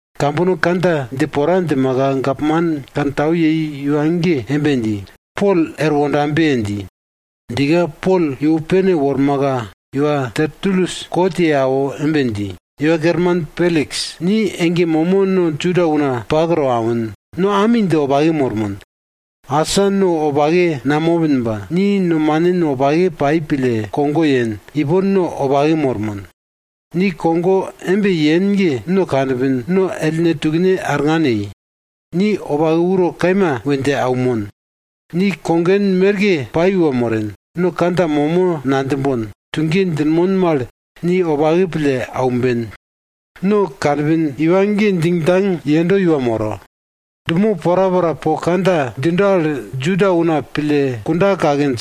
Kambono kandja dje pora djimaka, gapman kantau yei iwa ge embe dji, Pol er wondabe! dji. Djika Pol iwo pene wormaka, iwa Tertulus kot ye awo embe dji, iwa Kerman Peliks, ni ege momo no Juda una pak to awin, no ami dje wopake mormon. Asa no wopake namopin ba, ni nomanin wopake pai pille kogo yen, ipon no wopake mormon. Ni kogo embe yen ge, no kanpin, no ellne tukne arngan yei. Ni wopake uro kaima we dje aunmon. Ni kogen merke pai iwa moren, no kandja momo nadjimbon, tuge djinmon mal ni wopake pille aumben. No kanpin iwa ge djingdjang yendo iwa moro. Dumo porapora po kandja djindo al, Juda una pille kunda kakinj.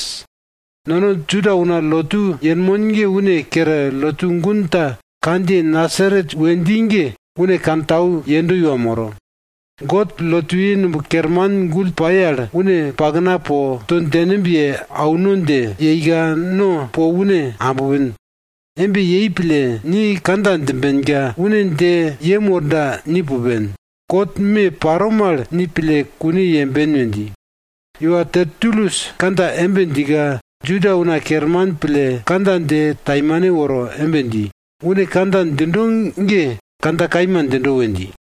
Nono Juda una lotu yenmon ge une kere, lotu gun ta kandjiye Nasaret we dji ge une kantau yendo iwa moro. God lotuye numb kerman gull pai al une pakna po to djengimb ye auno dje yeika, no po une ambpin. Embe yei pille ni kandja djimbenka, une dje yem worda ni pupen. Kot me paro mal ni pille kune yemben we dji. Iwa Tertulus kandja embe djika, Juda una kerman pille kandja dje taimane woro embe dji, une kandja djindo ge kandja kaima djindo we dji.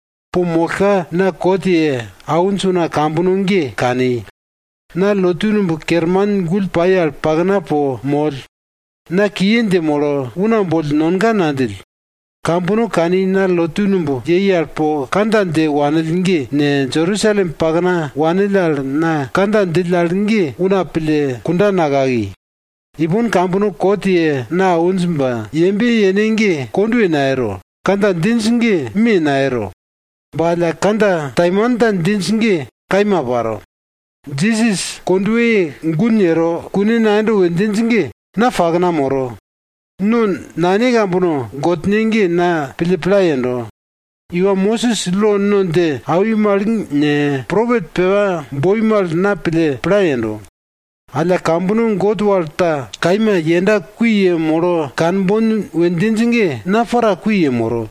Po mollka na kot ye awinj una kambono ge kani. Na lotu numb kerman gull pai al pakna po moll. Na kiye dje molo, una boll nonga nadjill. Kambono kani na lotu numb yei al po kandja dje wanill ge ne, Jerusalem pakna wanill al na kandja djill al ge una pille kunda nakaki. Ipon kambono kot ye na awinj ba yembe yene ge kondwe nayero, kandja djinj ge me naparo. Ba alla kandja taimanta djinj ge kaima paro. Jisas kondweye gun yero kune nayendo we djinj ge, na pakna moro, no nane kambono Godne ge na pille pla yendo. Iwa Mosis lo no dje awi mal ne, propet pepa boi mal na pille pla yendo. Alla kambono God wal ta kaima yenda kui yemolo kanbon we djinj ge na para kui yemoro.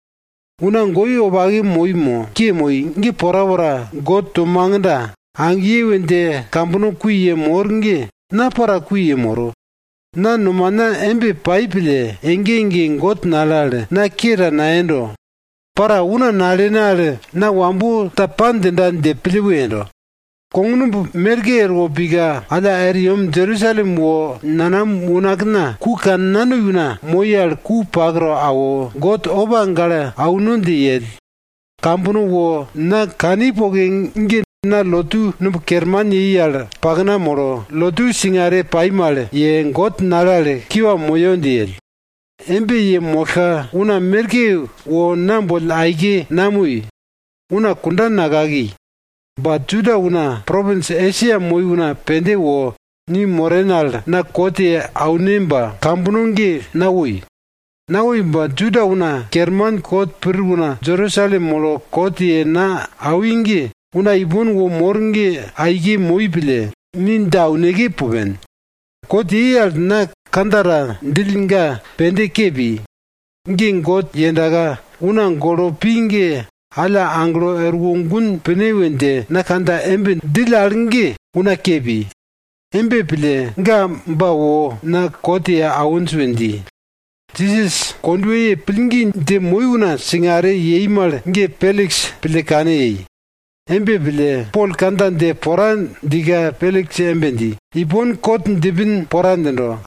Una goi wopake moi mo, ke moi ge porapora God to magda, agiye we dje kambono kui yemor ge na para kui yemoro. Na nomana embe pai pille ege ege God nale al na ke ta nayendo. Para una nalene al na wambo ta pa djinda dje pille we yendo. Kognumb merke erwo pika, alla er yem Jerusalem wo nanam unakna ku kannanoi una moi al ku pak to awo, God opa gale auno dje yell. Kambono wo na kani poke ge na lotu numb kerman yei al pakna molo, lotu singare pai mal ye, God nale al kiwa moyo dje yell. Embe yemollka una merke wo na boll aike namoi, una kunda nakaki. Ba Juda una propins Esia moi una pende wo ni moren al na kot ye aune ba kambono ge nawoi. Nawoi ba Juda una kerman kot pir una Jerusalem molo kot ye na awi ge, una ipon wo mor ge aike moi pille, ni dje auneke pupen. Kot yei al na kandja ta djill ga pende ke pi. Ge God yendaka una golo pi ge alla aglo erwo gun pine we dje na kandja embe djill al ge una ke pi. Embe pille ga ba wo na kot ye awinj we dji. Jisas kondweye pai mal pillgi dji una singare yei mal ge Peliks pille kane yei. Embe pille, Pol kandja dje pora djika Peliks embe dji, ipon kot djipin pora djindo.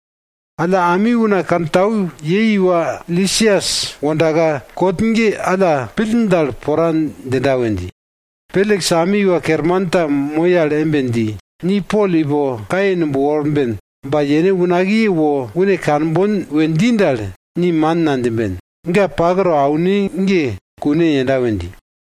Alla ami una kantau yei iwa Lisias wondaka, kot ge alla pill dal pora djinda we dji. Peliks ami iwa kerman ta moi al embe dji, ni Pol ipo kaye numb worben ba yene unakiye wo une kanbon we dji dal, ni man nadjimben, ga pak to aune ge kune yenda we dji.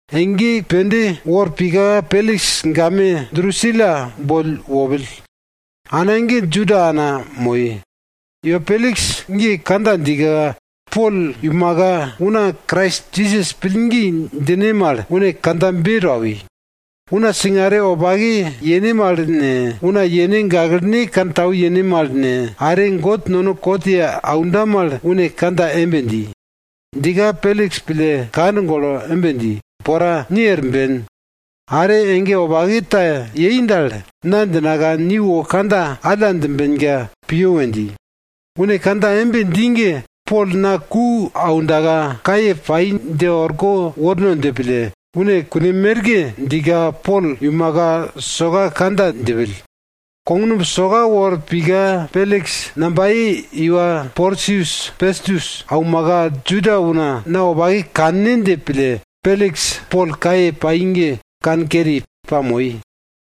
Ege pende wor pika Peliks game Drusila boll wopill. Ana ge Juda ana moi. Iwa Peliks ge kandja djika, Pol iumaka una Krais Jisas pillgi djine mal une kandjabe to awi. Una singare wopake yene mal ne, una yene gaklene kantau yene mal ne, are God nono kot ye aunda mal une kandja embe dji. Djika, Peliks pille kand golo embe dji, pora, ni er ben. Are ege wopake ta yei dal, na djinaka ni wo kandja alla djimbenka piyo we dji. Une kandja embe dji ge, Pol na ku aundaka kaye pai dje orko worno dje pille, une kun merke djika Pol iumaka soka kandja djipill. Kognumb soka wor pika Peliks nambaye i iwa Porsius Pestus aumaka, Juda una na wopake kanne dje pille, Peliks Pol kaye pai ge kankeri, pamoi.